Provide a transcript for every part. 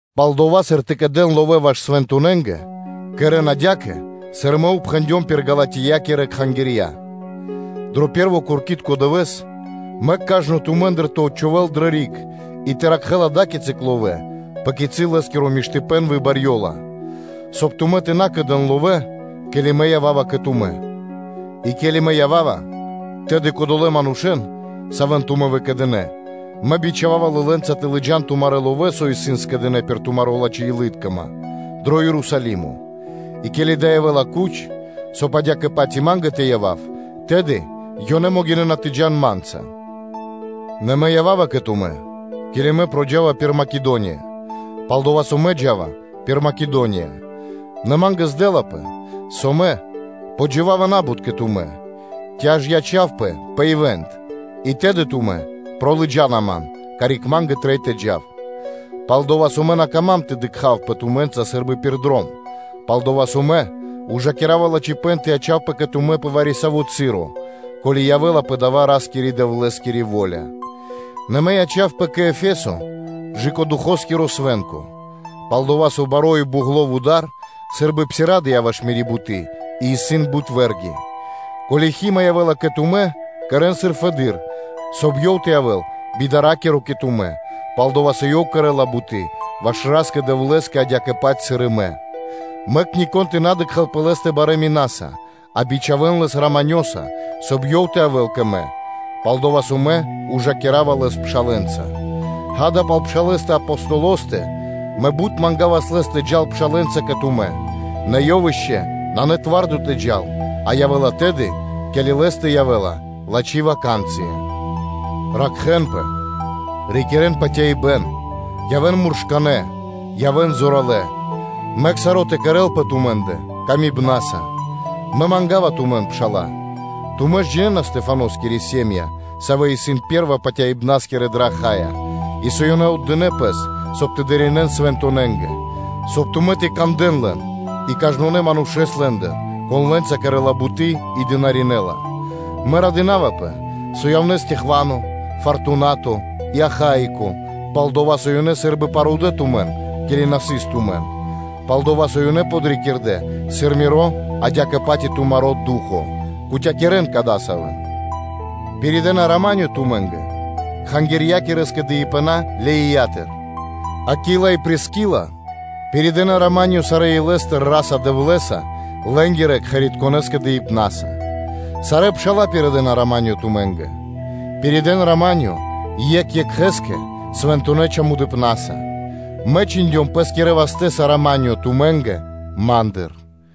Пал дова́, сыр тэ кэдэн ловэ́ ваш свэнтонэнгэ, кэрэ́н адя́кэ, сыр мэ упхэндём пир Галатиякирэ кхангирья. Дро пэ́рво куркитко дывэ́с мэк кажно тумэ́ндыр тэ отчхувэл дрэ риг и тэ ракхэ́л ада́кицы ловэ́, пэ кицы́ лэ́скиро миштыпэ́н выбарьёла, соб (кай) тумэ́ тэ на кэдэн ловэ́, ке́ли мэ ява́ва кэ тумэ́. И ке́ли мэ ява́ва, тэды кодолэ́ манушэ́н, савэ́н тумэ́ выкэдынэ́, мэ бичхава́ва лылэнца тэ лыджа́н тумарэ́ ловэ́, со исын скэдынэ́ пир тумари́ лачхэ́-илы́ткима дро Ерусалимо: и ко́ли дава́ явэ́ла куч, соб (кай) адя́кэ-паць и ма́нгэ тэ явав, тэды ёнэ могинэ́на тэ джа́н ма́нца. Нэ мэ ява́ва кэ тумэ́, ке́ли мэ проджава пир Македония; пал-дова́ со мэ джа́ва пир Македония. Нэ ма́нгэ здэлапэ, со мэ ява́ва тэ джива́ва на́бут (куты́) кэ тумэ́, ци аж ячавпэ пэ ивант (зима), и тэды тумэ́ пролыджана ман, карик ма́нгэ трэй тэ джав. Пал-дова́ со мэ на кама́м тэ дыкхавпэ тумэ́нца сы́рбы пир дром, пал-дова́ со мэ ужакирава лачхипэ́н тэ ячавпэ кэ тумэ́ пэ вари-саво́ часо, ко́ли явэ́ла пэ дава́ Ра́скирэ-Дэвлэ́скири во́ля. Нэ мэ ячавпэ кэ Эфесо кэ Духоскиро свэ́нко. Пал-дова́ со баро́ и бугло вуда́р сы́рбы псирадыя ваш мири́ буты́, а исын бут вэ́рги. Ко́ли Хима (Тимофеё) явэ́ла кэ тумэ́, кэрэ́н, сыр исын фэды́р, соб (кай) ёв тэ явэ́л би дара́киро кэ тумэ́, пал-дова́ со ёв кэрэ́ла буты́ ваш Ра́скэ-Дэвлэ́скэ, адя́кэ-паць, сыр и мэ. Мэк нико́н тэ на дыкхэ́л пэ лэ́стэ барэ́ минаса, а бичхавэн лэс раманёса, соб (кай) ёв тэ явэ́л кэ мэ; пал-дова́ со мэ ужакирава лэс пшалэ́нца. Ѓа́да, пал пшалэ́стэ Аполосостэ, мэ бут мангавас лэс тэ джал пшалэ́нца кэ тумэ́, нэ ёв ишчо (инкэ́) нанэ скэдыно́ дро ду́хо (фа́но) тэ джал, а явэ́ла тэды, ке́ли лэ́стэ явэ́ла лачхи́ ваканцыя (случаё). Ракхэ́нпэ, рикирэ́н патяибэ́н; явэ́н муршканэ́, явэ́н зоралэ́. Мэк саро́ тэ кэрэ́лпэ тумэ́ндэ ласка́са и патыва́са. Мэ манга́ва тумэн, пшала́лэ, тумэ́ ж джинэ́на Стэхфаноскири сэ́м΄я (ири́), савэ́ исын пэ́рва патяибнаскирэ дрэ Ахайя, и со ёнэ отдынэ́ пэс, соб (кай) тэ дынаринэ́н свэнтонэнгэ; соб (кай) тумэ́ тэ кандэ́н лэн и кажнонэ́ манушэ́с лэ́ндыр, кон лэ́нца кэрэ́ла буты́ и дынаринэла. Мэ радынавпэ, со явнэ́ Стехвано, Фартунато и Ахаико; пал-дова́ со ёнэ сы́рбы парудэ тумэн, ке́ли на сыс тумэн. Пал-дова́ со ёнэ подрикирдэ сыр миро адя́кэ-паць и тумаро́ ду́хо (фа́но): кутякирэн (патывакирэн) кадасавэн. Пиридэна “рама́нё” тумэ́нгэ кхангирья́кирэ скэдыибэна Леиятыр. Акила и Прискила пиридэна “рама́нё” сарэ́ илэ́стыр Ра́са-Дэвлэ́са лэ́нгирэ кхэритконэ́ скэдыибнаса. Сарэ́ пша́ла пиридэна “рама́нё” тумэ́нгэ. Пиридэ́н “рама́нё” екх екхэ́скэ свэнтонэ́ чамудыпнаса. Мэ чхиндём пэ́скирэ вастэ́са “рама́нё” тумэ́нгэ ма́ндыр.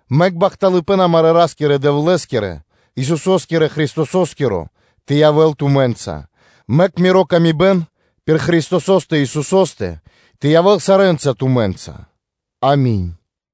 Мэк бахталыпэ́н амарэ́ Ра́скирэ-Дэвлэ́скирэ, Исусо́скирэ Христосо́скиро тэ явэ́л тумэ́нца. Мэк мири́ паты́в кэ яви́р мануша́ пир Христосо́стэ Исусо́стэ тэ явэ́л сарэ́нца тумэ́нца. Ами́нь.